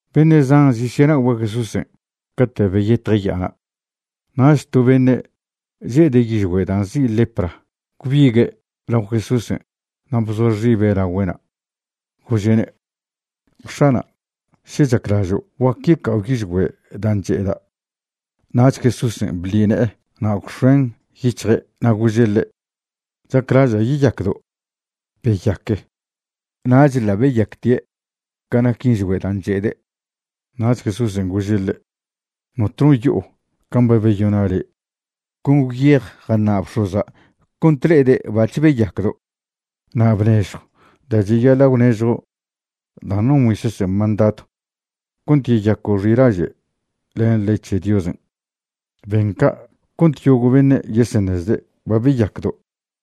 Beṉe' zan zesyenagüe' Jesúsen' cate' beyetje' ya'ana'. Nach to beṉe' che'ede' yižgüe' dan' nzi' lepra gwbigue' lao Jesúsen' na' bzoa xibe' lagüe'na' gože'ne': ―X̱ana', še chaclažo' guac yeca'o yižgüe' dan' che'eda'. Nach Jesúsen' bḻi ne'e na' gwx̱oen' yic̱hje' na' gože' ḻe': ―Chaclaža' yeyacdo'. Beyaque. Nach ḻa' beyactie' ca nac yižgüe' dan' che'ede'. Nach Jesúsen' gože' ḻe': ―Notno yo'o can' ba beyona' le'. Con gwyej jaṉa' bx̱oza' cont le'ede' bac̱h beyacdo'. Na' bnežjw da' cheyaḻa' gwnežjo' dan' non Moisésen' mandadw cont yeyaco' xilaže' len ley c̱he Diosen'. Ben ca' cont yogo' beṉe' yeseṉezde' ba beyacdo'.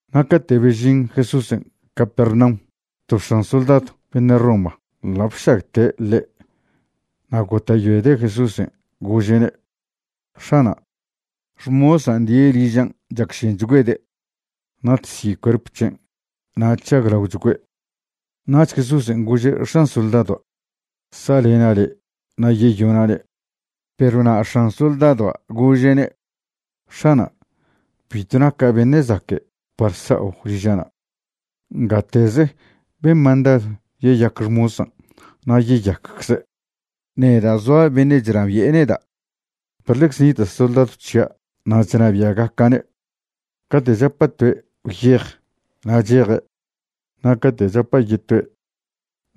Na' cate' bežin Jesúsen' Capernaum to x̱an soldadw beṉe' Roma ḻa' bšagte' ḻe'. Na' gota'yoede' Jesúsen', gože'ne': ―X̱ana', xmosan' die' ližan' chacšenchgüede'. Natsi' cuerp c̱hen' na' chžaglaochgüe'. Nach Jesúsen' gože' x̱an soldadoa': ―Sa'lena' le' na' yeyona'ne'. Perw na' x̱an soldadoa' gože'ne': ―X̱ana', bitw naca' beṉe' zaque' par sa'o liža'na'. Ngateze ben mandadw yeyac xmosan' na' yeyaccze'. Neda' zoa beṉe' chnabi'e neda', perw ḻecze nita' soldadw c̱hia' na' chnabia'gaca'ne'. Cate' chapa' toe': “Gwyej”, na' cheje', na' cate' chapa' yetoe':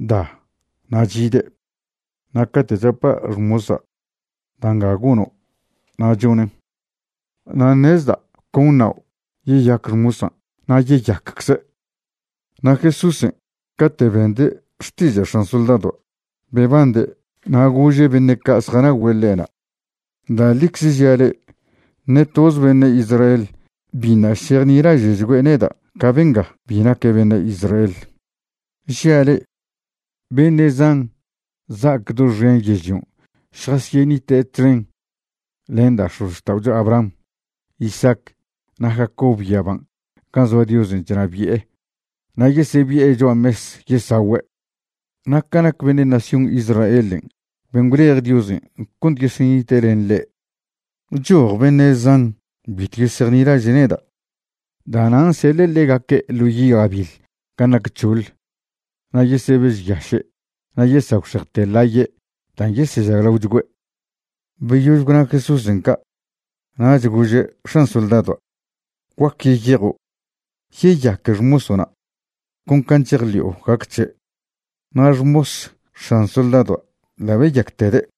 “Da”, na' chide', na' cate' chapa' xmosa': “Da' nga gono'”, na' chonen'. Nan' ṉezda' con ṉao' yeyac xmosan' na' yeyaccze'. Na' Jesúsen' cate' bende' xtiža' x̱an soldadoa' bebande' na' gože' beṉe' ca' zjanagüe' ḻe'na': ―Da' ḻicze žia' le'e, ṉe toze beṉe' Israel biṉa' šejnilaže'chgüe' neda' ca benga bi naque' beṉe' Israel. Žia' le'e, beṉe' zan za'ac doxen yežlion' šjasyenite' txen len da' x̱ozxta'ocho Abraham, Isaac na' Jacob yaban' gan' zoa Diosen' chnabi'e na' yesebi'e cho'a mes yesagüe'. Na' ca nac beṉe' nación Israelen' ben' gwlej Diosen' cont yesenite' len ḻe', choj beṉe' zan bitw yesejnilaže' neda'. Da'nan' seḻe' ḻegaque' ḻo' yi' gabiḻ gan' nac c̱hoḻ na' yesebežyaše' na' yesagwxejte ḻaye' dan' yesežaglaochgüe'. Beyož gwna Jesúsen' ca' nach gože' x̱an soldadoa': ―Guac yeyejo'. Yeyaque xmoso'na', con can' chejḻi'o gac c̱he'. Na' xmos x̱an soldadoa' ḻa' beyactede'.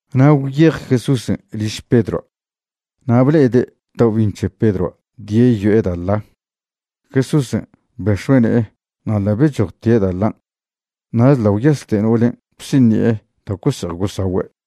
Na' gwyej Jesúsen' liž Pedroa', na' ble'ede' taobi'iṉ c̱he Pedroa' die' yo'e da' ḻa. Jesúsen' bex̱ue' ne'e na' ḻa' bechojtie' da' ḻan'. Nach ḻa' gwyaste no'olen' bsiṉi'e da' gose'ej gosagüe'.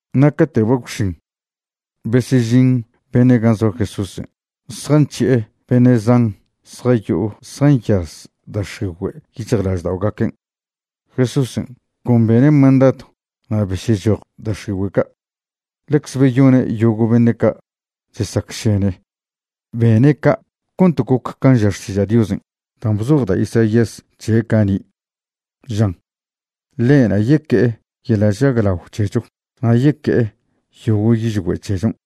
Na' cate' ba gwx̱in, besežin beṉe' gan' zoa Jesúsen' zjanc̱hi'e beṉe' zan zjayo'o zjanyaz da' x̱igüe' yic̱hjlažda'ogaquen'. Jesúsen' con bene' mandadw na' besyechoj da' x̱igüe' ca'. Ḻecze beyone' yogo' beṉe' ca' chesacšene. Bene' ca' cont goc can' ža Xtiža' Diosen' dan' bzoj da' Isaías c̱he' cani', žan: “Ḻe'na' yeque'e yeḻa' chžaglao c̱hecho na' yeque'e yogo' yižgüe' c̱hechon'.”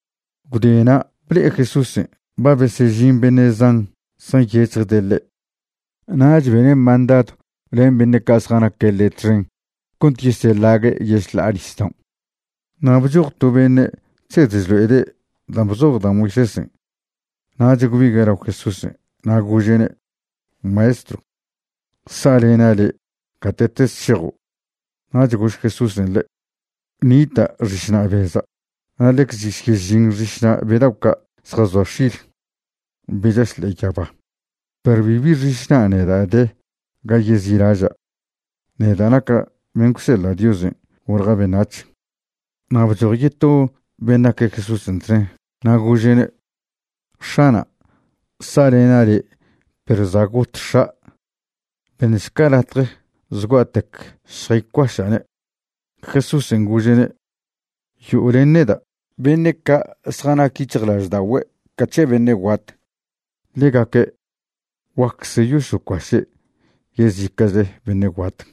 Gwde na' ble'e Jesúsen' ba besežin beṉe' zan zjanyec̱hjde' ḻe', nach bene' mandadw len beṉe' ca' zjanaque' ḻe' txen cont yeseḻague' yešḻa'a nisdaon'. Na' bchoj to beṉe' chsed chlo'ede' dan' bzoj da' Moisésen' nach gwbigue' lao Jesúsen' na' gože'ne': ―Maestrw, sa'lena' le' gate'tez šejo'. Nach gož Jesúsen' ḻe': ―Nita' xišna' beza' na' ḻecz chesyežin xišna' be dao' ca' zjazoa x̱il, be chaš ḻe'e yaba, perw bibi xišna' neda' de ga yezi'laža', neda' naca' ben' gwseḻa' Diosen' golja' beṉac̱h. Na' bchoj yeto ben' naque' Jesúsen' txen na' gože'ne': ―X̱ana', sa'lena' le' perw za' got x̱a'. Beṉšca latje zgua'tec šjaycuaša'ne'. Jesúsen' gože'ne': ―Yo'o len neda'. Beṉe' ca' zjanac yic̱hjlažda'ogüe' ca c̱he beṉe' guat, ḻegaque' guaccze yosocuaše' yezica'chle beṉe' guat.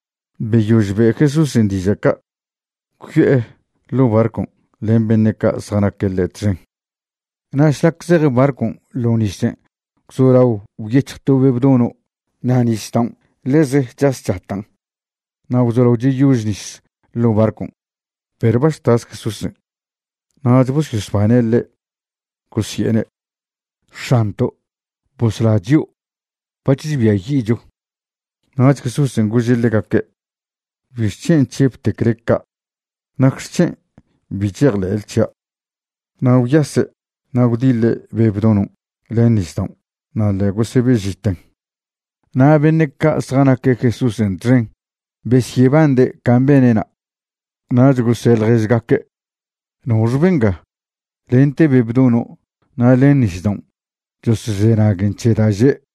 Beyož be' Jesúsen' diža' ca', gwyo'e ḻo' barcon' len beṉe' ca' zjanaque' ḻe' txen. Na' šlac zej barcon' ḻo nisen' gwzolao gwyec̱hj to be' bdono' na' nisdaon' ḻeze chas chatan' na' gwzolao cheyož nis ḻo' barcon', perw ba chtas Jesúsen'. Nach bosyosbane' ḻe' gosi'ene': ―¡X̱anto'! ¡Bosla chio'! ¡Bach chbiayi'cho! Nach Jesúsen' gože' ḻegaque': ―¿Bixc̱hen' chžebtecle ca'? ¿Nacxec̱hen' bi chejḻe'le c̱hia'? Na' gwyase' na' gwdiḻe' be' bdonon' len nisdaon', na' ḻa' gosebe'žiten. Na' beṉe' ca' zjanaque' Jesúsen' txen besyebande' can' bene'na', nach gose' ḻježgaque': ―¿Noxe benga? lente be' bdono' na' len nisdaon' chosozenaguen c̱he da' že'.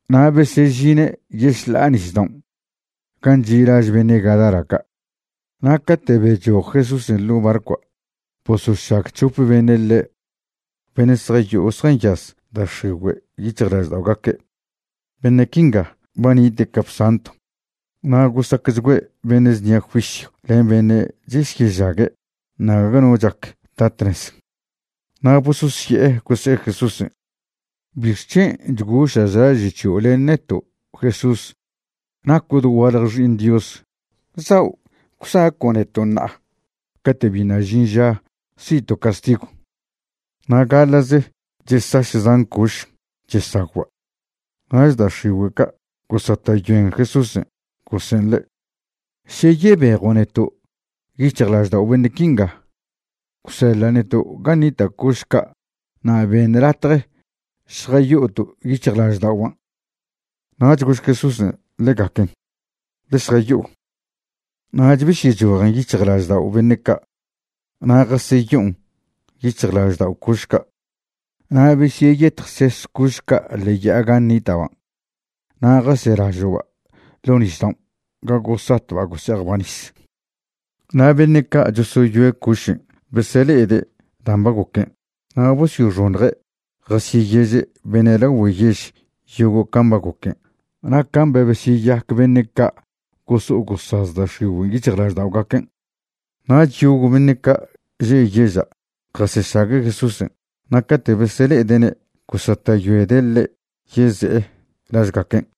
Na' besežine' yešḻa'a nisdaon' gan' chi' laž beṉe' Gadara ca'. Na' cate' bechoj Jesúsen' ḻo' barcoa' bosošag c̱hope beṉe' ḻe', beṉe' zjayo'o zjanyaz da' x̱igüe' yic̱hjlažda'ogaque'. Beṉe' quinga ba nite' capsantw na' gosacchgüe' beṉe' znia juisyw len beṉe' chesyežague' na' gague no chac ta tnez. Na' bososye'e gose'e Jesúsen': ―¿Bixc̱hen' chgoša' chlaže' c̱hio' len neto', Jesús? Naco' dogualje Xi'iṉ Dios. ¿Zao' gwsaco' neto' ṉa'a cate' biṉa' žin ža si'to' castigw? Na' gaḻa'ze chesaš zan coš chesagwba'. Nach da' x̱igüe' ca' gosata'yoen Jesúsen' gose'en ḻe': ―Še yebejo' neto' yic̱hjlaždao' beṉe' quinga, gwseḻa' neto' gan' nita' coš ca' na' beṉ latje šjayo'oto' yic̱hjlažda'oban'. Nach gož Jesúsen' ḻegaquen: ―Ḻe šjayo'o. Nach besyechojen yic̱hjlaždao' beṉe' ca' na' jaseyo'on yic̱hjlaždao' coš ca'. Na' besyeyetjses coš ca' ḻe'e ya'a gan' nita'ban', na' jaselažo'ba' ḻo' nisdaon' ga gosatba' gose'ejba' nis. Na' beṉe' ca' chosoyoe' cošen' besele'ede' dan' ba goquen na' bosyoxoṉje' jasyeyeže' beṉe' lagüe' yež yogo' can' ba goquen' na' can' ba besyeyac beṉe' ca' goso'o gosaz da' x̱igüen' yic̱hjlažda'ogaquen'. Nach yogo' beṉe' ca' že' yeža' jasešague' Jesúsen' na' cate' besele'ede'ne' gosata'yoede' ḻe' yeze'e lažgaquen'.